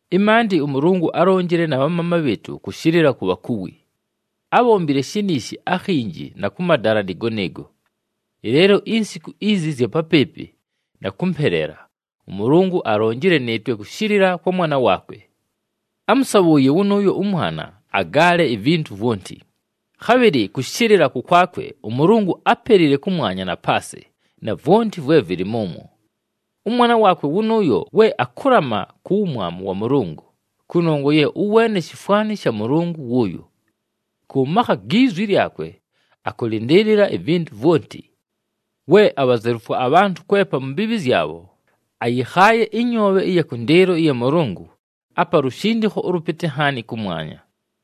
Ɨmaandɨ, ʉMʉlʉngʉ álonjile na bhamaama bhɨɨtʉ kʉshɨlɨla ku bhakuwi. Ábhombile shiniishi akhinji, na kʉ madala nɨɨgo nɨɨgo. Ɨleelo insiku izi ɨzya papɨɨpɨ na kʉmpeleela, ʉMʉlʉngʉ alonjile nɨɨtwe kʉshɨlɨla kwa Mwana waakwe. Ámʉsabhʉʉye wʉnʉʉyo ʉMwana agaale ivintu vwonti, khabhɨlɨ kʉshɨlɨla kʉkwakwe ʉMʉlʉngʉ ápelile kʉmwanya na paasɨ na vwonti vwe vɨlɨ mʉmwo. ɄMwana waakwe wʉnʉʉyo we akʉlama ku wumwamu wa Mʉlʉngʉ, kʉnongwa ye ʉweene shifwani sha Mʉlʉngʉ wʉʉyo. Kʉ makha gi zwi lyakwe akʉlɨndɨɨlɨla ivintu vwonti. We abhazelufwa abhantʉ kwepa mu mbiibhi zyabho, ayɨkhaaye ɨnyoobhe ɨya kʉndɨɨlo ɨya Mʉlʉngʉ apa lushindikho ʉlʉpɨtɨ nhaani kʉmwanya.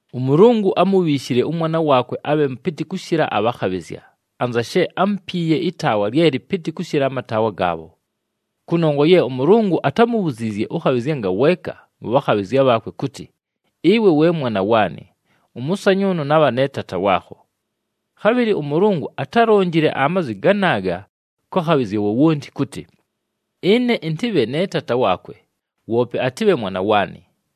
ɄMʉlʉngʉ ámubhiishile ʉMwana waakwe abhe mʉpɨtɨ kʉshɨla abhakhabhɨzya, anza she ámupiiye ɨtaawa lye lɨpɨtɨ kʉshɨla amataawa gaabho. Kʉnongwa ye ʉMʉlʉngʉ atámubhuziizye ʉkhabhɨzya ngaweeka mʉ bhakhabhɨzya bhaakwe kʉtɨ, “Ɨwe we Mwana waanɨ, ʉmʉsanyʉʉnʉ nabha ne Taata waakho.” Khabhɨlɨ ʉMʉlʉngʉ atálonjile amazwi ganaaga kwa khabhɨzya wowonti kʉtɨ, “Ɨne ɨntɨbhe ne Taata waakwe, woope atɨbhe Mwana waanɨ.”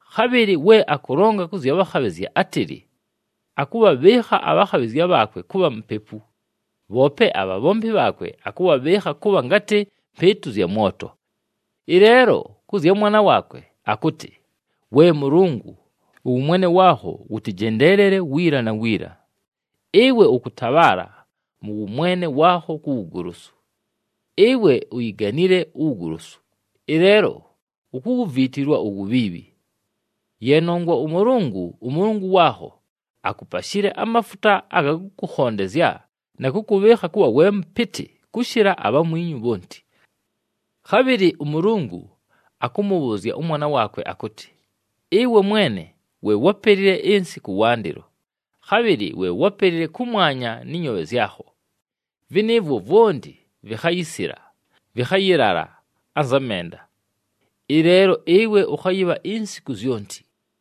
Khabhɨlɨ we akʉlonga kʉ zya bhakhabhɨzya, átɨlɨ, “Akʉbhabhɨɨkha abhakhabhɨzya bhaakwe kʉbha mupepu, bhoope abhabhombi bhaakwe akʉbhabhɨɨkha kʉbha ngatɨ mbɨɨtʉ zya mwoto.” Ɨleelo kʉ zya Mwana waakwe akʉtɨ, “We Mʉlʉngʉ, ʉwʉmwene waakho wʉtɨjendeelele wiila na wiila! Ɨwe ʉkʉtabhaala mʉ wʉmwene waakho ku wugolosu. Ɨwe uyiganile uwugolosu, ɨleelo ukuwuviitilwa uwubhiibhi. Ye nongwa ʉMʉlʉngʉ, ʉMʉlʉngʉ waakho, akupashile amafuta aga kʉkʉkhondezya na kʉkʉbhɨɨkha kʉbha we mʉpɨtɨ kʉshɨla abhamwinyu bhonti.” Khabhɨlɨ ʉMʉlʉngʉ akʉmʉbhʉʉzya ʉMwana waakwe akʉtɨ, “Ɨwe Mwene we wápelile ɨnsɨ kʉwandɨlo, khabhɨlɨ we wápelile kʉmwanya nɨ nyoobhe zyakho. Vɨnɨɨvwo vwonti vikhayisila, vɨkhayɨlala anza menda. Ɨleelo ɨwe ʉkhayɨbha insiku zyonti.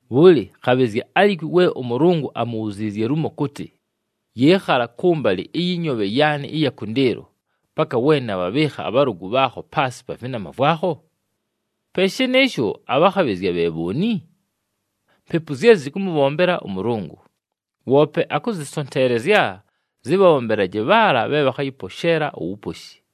Bhʉlɨ, khabhɨzya alikwi we ʉMʉlʉngʉ amubhuziizye lumo kʉtɨ, “Yɨɨkhala kʉmbalɨ ɨyɨ nyoobhe yaanɨ ɨya kʉndɨɨlo, paka we nabhabhɨɨkha abhalʉgʉ bhaakho paasɨ pa vɨnama vwakho”? Pe shɨnɨɨsho, abhakhabhɨzya bhe bhooni? Mpepu zye zɨkʉmʉbhombela ʉMʉlʉngʉ, woope akʉzɨsonteelezya zɨbhabhombelaje bhaala bhe bhakhayɨposheela uwuposhi.